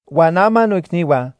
Huan ama noicnihua,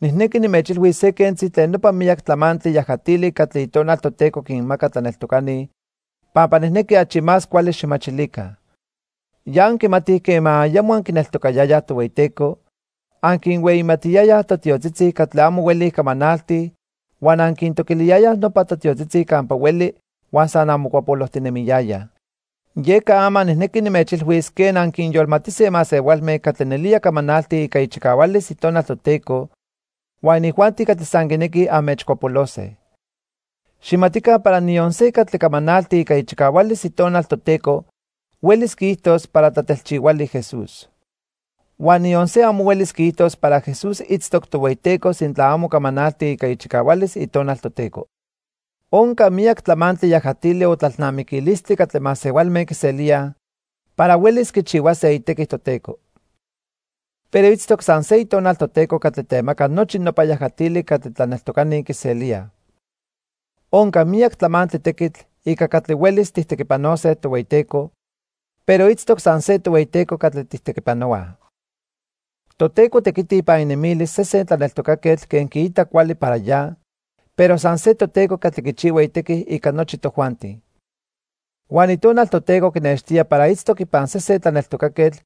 nijnequi nimechilhuis se quentzi tlen nopa miyac tlamantli yajatili catli Itonal Toteco quinmaca tlaneltocani pampa nijnequi achi más cuali xijmachilica. Ya anquimatij quema ayamo anquineltocayayaj Tohueyiteco, anquinhueyimatiyayaj totiotzitzi catli amo huelij camanaltij huan anquintoquiliyayaj nopa totiotzitzi campa hueli huan san anmocuapolojtinemiyayaj. Yeca ama nijnequi nimechilhuis quen anquinyolmatise masehualme catli nelía camanaltij ica ichicahualis Itonal Toteco huan inijuanti catli san quinequij anmechcuapolose. Xijmatica para niyon se catli camanalti ica ichicahualis Itonal Toteco huelis quiijtos para tlatelchihuali Jesús. Huan niyon se amo huelis quiijtos para Jesús itztoc Tohueyiteco sintla amo camanalti ica ichicahualis Itonal Toteco. Onca miyac tlamantli yajatili o tlalnamiquilistli catli masehualme quiselíaj para huelis quichihuase itequi Toteco. Pero itztoc san se Itonal Toteco catli temaca nochi nopa yajatili catli tlaneltocani quiselíaj. Onca miyac tlamantli tequitl ica catli huelis tijtequipanose Tohueyiteco, pero itztoc san se Tohueyiteco catli tijtequipanohuaj. Toteco tequiti ipan inemilis sesen tlaneltocaquetl quen quiita cuali para ya, pero san se Toteco catli quichihua itequi ica nochi tojuanti. Huan Itonal Toteco quinextía para itztoc ipan sesen tlaneltocaquetl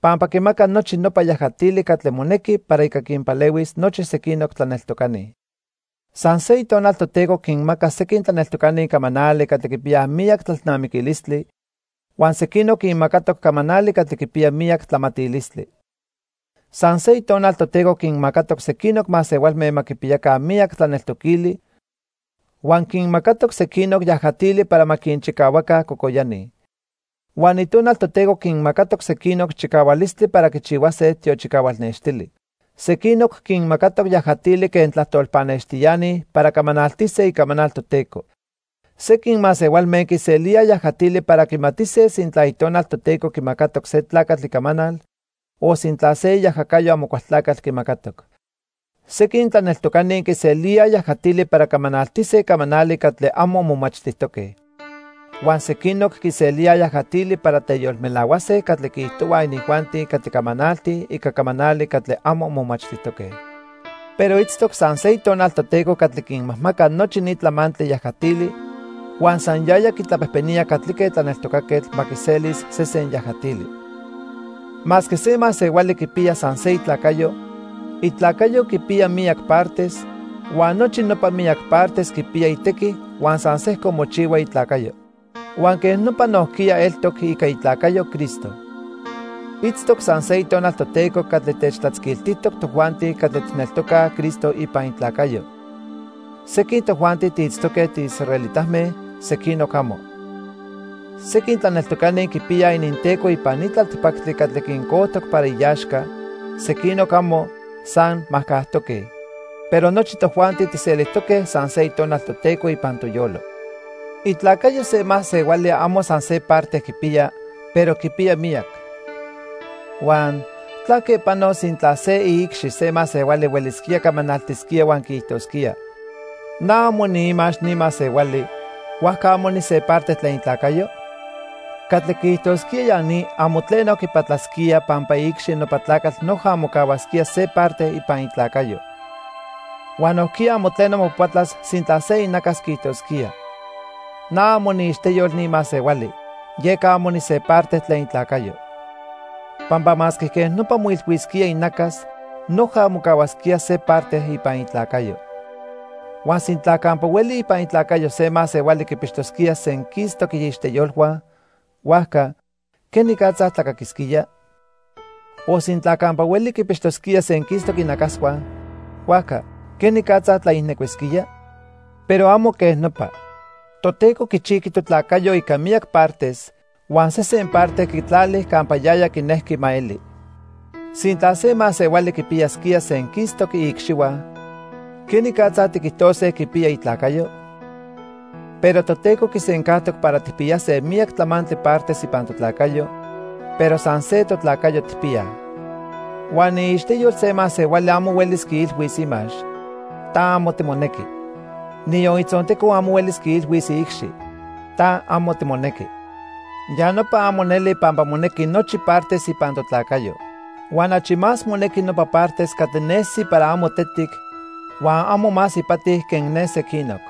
pampa quimaca nochi nopa yajatili catli monequi para ica quinpalehuis nochi sequinoc tlaneltocani. San se Itonal Toteco quinmaca sequin tlaneltocani camanali catli quipiyaj miyac tlalnamiquilistli, huan sequinoc quinmacatoc camanali catli quipiya miyac tlamatilistli. San se Itonal Toteco quinmacatoc sequinoc masehualme ma quipiyaca miyac tlaneltoquili huan quinmacatoc sequinoc yajatili para ma quinchicahuaca cocoyani. Huan Itonal Toteco quinmacatoc sequinoc chicahualistli para quichihuase tiochicahual nextili. Sequinoc quinmacatoc yajatili quen tlajtol pannextiani para camanaltise icamanal Toteco. Sequin masehualme quiselíaj yajatili para quimatise sintla Itonal Toteco quimacatoc se tlacatl icamanal o sintla se iajacayo Amocualtlacatl quimacatoc. Sequin tlaneltocani quiselíaj yajatili para camanaltise camanali catli amo momachtijtoque. Huan sequinoc quiselíaj yajatili para teyolmelahuase catli quiijtohuaj inijuanti catli camanaltij ica camanali catli amo momachtijtoque. Pero itztoc san se Itonal Toteco catli quinmajmaca nochi ni tlamantli yajatili huan san yaya quitlapejpenía catlique tlaneltocaquetl ma quiselis sesen yajatili. Masque se masehuali quipiya san se itlacayo, itlacayo quipiya miyac partes huan nochi nopa miyac partes quipiya itequi huan san sejco mochihua itlacayo. Huan quej nopa nojquiya eltoc ica itlacayo Cristo. Itztoc san se Itonal Toteco catli techtlatzquiltijtoc tojuanti catli tijneltocaj Cristo ipan itlacayo. Sequin tojuanti tiitztoque tiisraelitame, sequinoc amo. Sequin tlaneltocani quipiyaj ininteco ipan ni tlaltipactli catli quincojtoc para iaxca, sequinoc amo, san majcajtoque, pero nochi tojuanti tijselijtoque san se Itonal Toteco ipan toyolo. Itlacayo se masehuali amo san se parte quipiya, pero quipiya miyac. Huan ¿tlaque panos sintla se iicxi se masehuali huelisquía camanaltisquía huan quiijtosquía: "Na amo niimax ni masehuali, huajca amo nise parte tlen itlacayo"? Catli quiijtosquía ya ni amo tleno quipatlasquía pampa iicxi nopa tlacatl noja mocahuasquía se parte ipan itlacayo. Huan nojquiya amo tleno mopatlas sintla se inacas quiijtosquía: "Na amo niiixteyol ni masehuali, yeca amo nise parte tlen itlacayo." Pampa masque quej nopa moilhuisquía inacas, noja mocahuasquía se parte ipan itlacayo. Huan sintla campa hueli ipan itlacayo se masehuali quipixtosquía senquistoc iixteyolhua, huajca ¿quenicatza tlacaquisquía? O sintla campa hueli quipixtosquía senquistoc inacashua, huajca ¿quenicatza tlaijnecuisquía? Pero amo quej nopa. Toteco quichijqui totlacayo ica miyac partes huan sesen parte quitlali campa yaya quinejqui ma eli. Sintla se masehuali quipiyasquía senquistoc iicxihua, ¿quenicatza tiquijtose quipiya itlacayo? Pero Toteco quisencajtoc para tijpiyase miyac tlamantli partes ipan totlacayo, pero san se totlacayo tijpiyaj. Huan iixteyol se masehuali amo huelis quiilhuis imax: "Ta amo timonequi", niyon itzonteco amo huelis quiilhuis iicxi: "Ta amo timonequi". Ya nopa amo neli pampa monequi nochi partes ipan totlacayo. Huan achi más monequi nopa partes catli nesi para amo tetic huan amo más ipati quen ne sequinoc.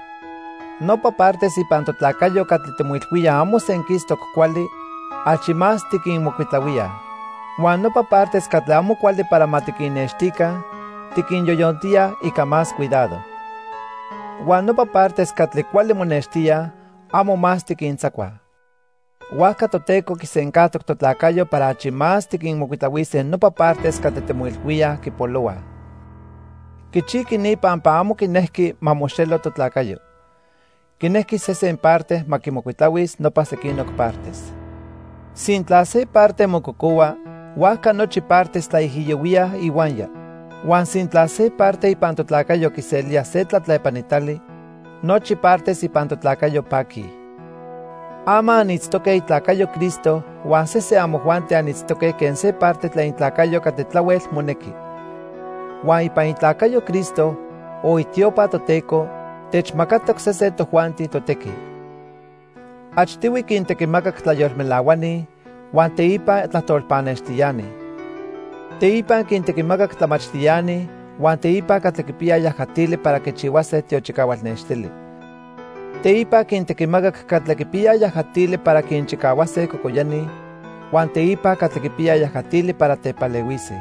Nopa partes ipan totlacayo catli timoilhuíaj amo senquistoc cuali, achi más tiquinmocuitlahuíaj. Huan nopa partes catli amo cuali para ma tiquinnextica, tiquinyoyontíaj ica más cuidado. Huan nopa partes catli cuali monextíaj, amo más tiquintzacuaj. Huajca Toteco quisencajtoc totlacayo para achi más tiquinmocuitlahuise nopa partes catli timoilhuíaj quipolohuaj. Quichijqui ni pampa amo quinejqui ma moxelo totlacayo. Quinequi sesen parte ma quimocuitlahuis nopa sequinoc partes. Sintla se parte mococohua, huajca nochi partes tlaijiyohuíaj ihuaya. Huan sintla se parte ipan totlacayo quiselía se tlatlepanitali, nochi partes ipan totlacayo paquij. Ama anitztoque itlacayo Cristo huan sesen amojuanti anitztoque quen se parte tlen itlacayo catli tlahuel monequi. Huan ipan itlacayo Cristo, o itiopa, Toteco techmacatoc sesen tojuanti totequi. Achtihui quintequimacac tlayolmelahuani huan, teipa tlajtol pannextiani. Teipa quintequimacac tlamachtiani huan teipa catli quipiyaj yajatili para quichihuase tiochicahual nextili. Teipa quintequimacac catli quipiyaj yajatili para quinchicahuase cocoyani, huan teipa catli quipiyaj yajatili para tepalehuise.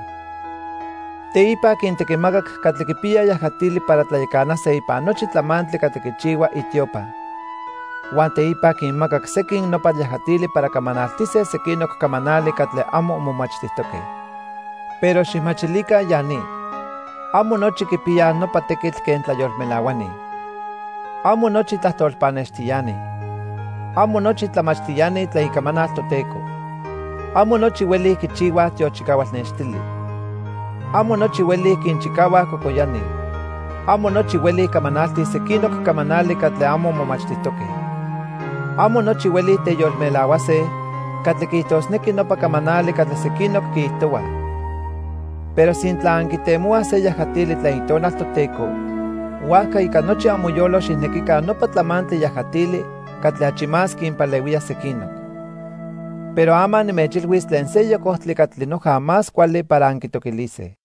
Teipa quintequimacac catli quipiyaj yajatili para tlayacanase ipan nochi tlamantli catli quichihua itiopa. Huan teipa quinmacac sequin nopa yajatili para camanaltise sequinoc camanali catli amo momachtijtoque. Pero xijmachilica ya ni. Amo nochi quipiyaj nopa tequitl quen tlayolmelahuani. Amo nochi tlajtol pannextiani. Amo nochi tlamachtiani tlen Icamanal Toteco. Amo nochi huelij quichihuaj tiochicahual nextili. Amo nochi huelij quinchicahuaj cocoyani. Amo nochi huelij camanaltij sequinoc camanali catli amo momachtijtoque. Amo nochi huelij teyolmelahuase catli quiijtosnequi nopa camanali catli sequinoc quiijtohuaj. Pero sintla anquitemohuaj se yajatili tlen Itonal Toteco, huajca ica nochi amoyolo xijnequica nopa tlamantli yajatili catli achi más quinpalehuía sequinoc. Pero ama nimechilhuis tlen seyoc ojtli catli noja más cuali para anquitoquilise.